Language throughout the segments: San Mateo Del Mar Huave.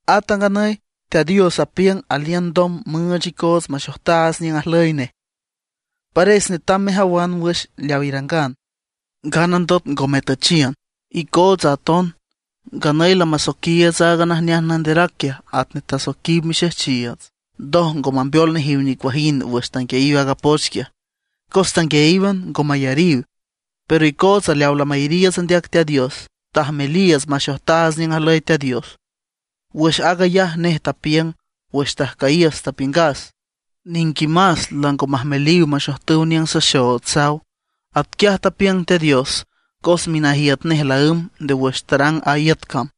Ata nganüy Teat Dios apiüng aliün ndom müüch icoots maxojtaats niüng ajlüy nej. Pares netam mejawan wüx leaw irangan, nganandot ngo metüchiün. Icoots aton nganüy lamasoiquiiüts aaga najneaj nanderac quiaj atnej tasoiquiw mixejchiiüts, ndoj ngo mambeol nejiw nicuajind wüx tanguiayiw a poch quiaj, cos tanguiayíwan, ngo mayariw. Pero icootsa leawa lamayariiüts andeac Teat Dios, tajmeliiüts maxojtaats niüng ajlüy Teat Dios. Wüx aag ayaj nej tapiüng: Wüx tajcüyiüs tapiüngas, niquimás lango majmeliw maxojtüw niüng saxood, saw. Atquiaj tapiüng Teat Dios cos minajiüt nej laǘmb nde wüx tarang a iüt cam.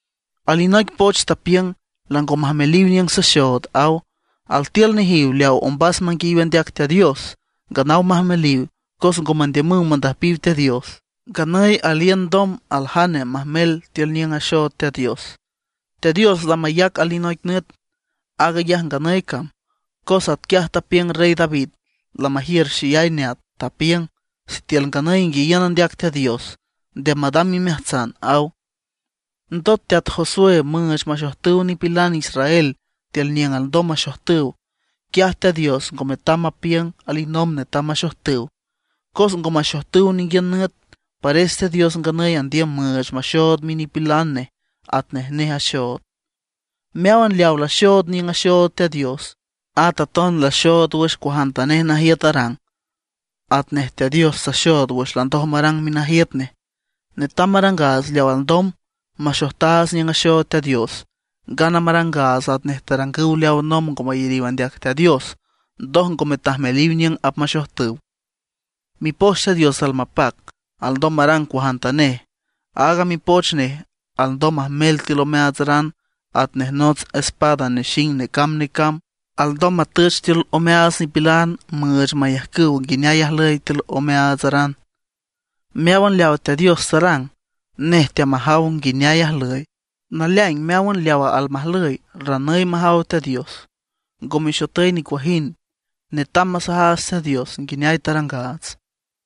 Alinoic poch tapiüng: Lango majmeliw niüng saxood, aw. Altiül nejiw leaw ombas manguiayiw andeac Teat Dios nganaw majmeliw, cos ngo mandiümüw mandüjpiw Teat Dios. Nganüy aliün ndom aljane majmel tiül niüng axood Teat Dios. Teat Dios lamayac alinoic nüt, aag ayaj nganüy cam. Cos atquiaj tapiüng Rey David, lamajiür xeyay neat, tapiüng: Sitiül nganüy inguiayiün andeac Teat Dios, nde madam imeajtsan, aw. Ndot teat Josué müüch maxojtüw nipilan Israel tiül niüng alndom maxojtüw, quiaj Teat Dios ngo metam mapiüng alinomb netam maxojtüw. Cos ngo maxojtüw ninguiün nüt, pares Teat Dios nganüy andiüm müüch maxood minipilan nej atnej nej axood. Meáwan leaw laxood niüng axood Teat Dios, at aton laxood wüx cuajantanej najiüt arang, atnej Teat Dios taxood wüx landoj marang minajiüt nej. Netam marangaats leaw alndom, maxojtaats niüng axood Teat Dios, ngana marangaats atnej tarangüw leaw nomb ngo mayariw andeac Teat Dios, ndoj ngome tajmeliw niüng apmaxojtüw. Mipoch Teat Dios almapac, alndom marang cuajantanej. Aaga Mipoch nej alndom majmel tiül omeaatsaran atnej nots espada nexing necamb necamb; alndom matüch tiül omeaats nipilan müüch mayajcüw nguineay ajlüy tiül omeaatsaran. Meáwan leaw Teat Dios tarang, nej teamajaw nguineay ajlüy. Naleaing meáwan leawa almajlüy, ranüy majaw Teat Dios, ngo mexotüy nicuajind. Netam masajaats Teat Dios nguineay tarangaats.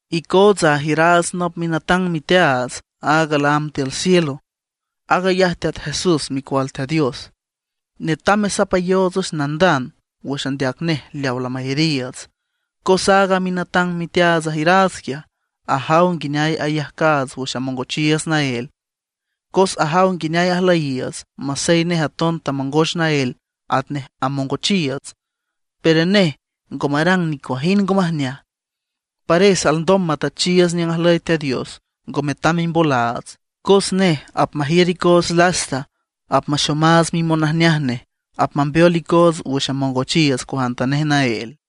Icoots ajiüraats nop minatang miteaats, aaga laámb tiül cielo. Aag ayaj Teat Jesús micual Teat Dios. Netam mesapayoots nandand wüx andeac nej leawa lamayariiüts. Cos aaga minatang miteaats ajiüraats quiaj, ajaw nguineay ayajcaats wüx amongochiiüts naél, cos ajaw nguineay ajlüyiiüts. Masey nej aton tamongoch naél atnej amongochiiüts, pero nej ngo marang nicuajind ngo majneaj. Pares alndom matüchiiüts niüng ajlüy Teat Dios, ngo metam mimbolaats, cos nej apmajiür icoots lasta, apmaxomaats mimonajneaj nej; apmambeol icoots wüx amongochiiüts cuajantanej naél.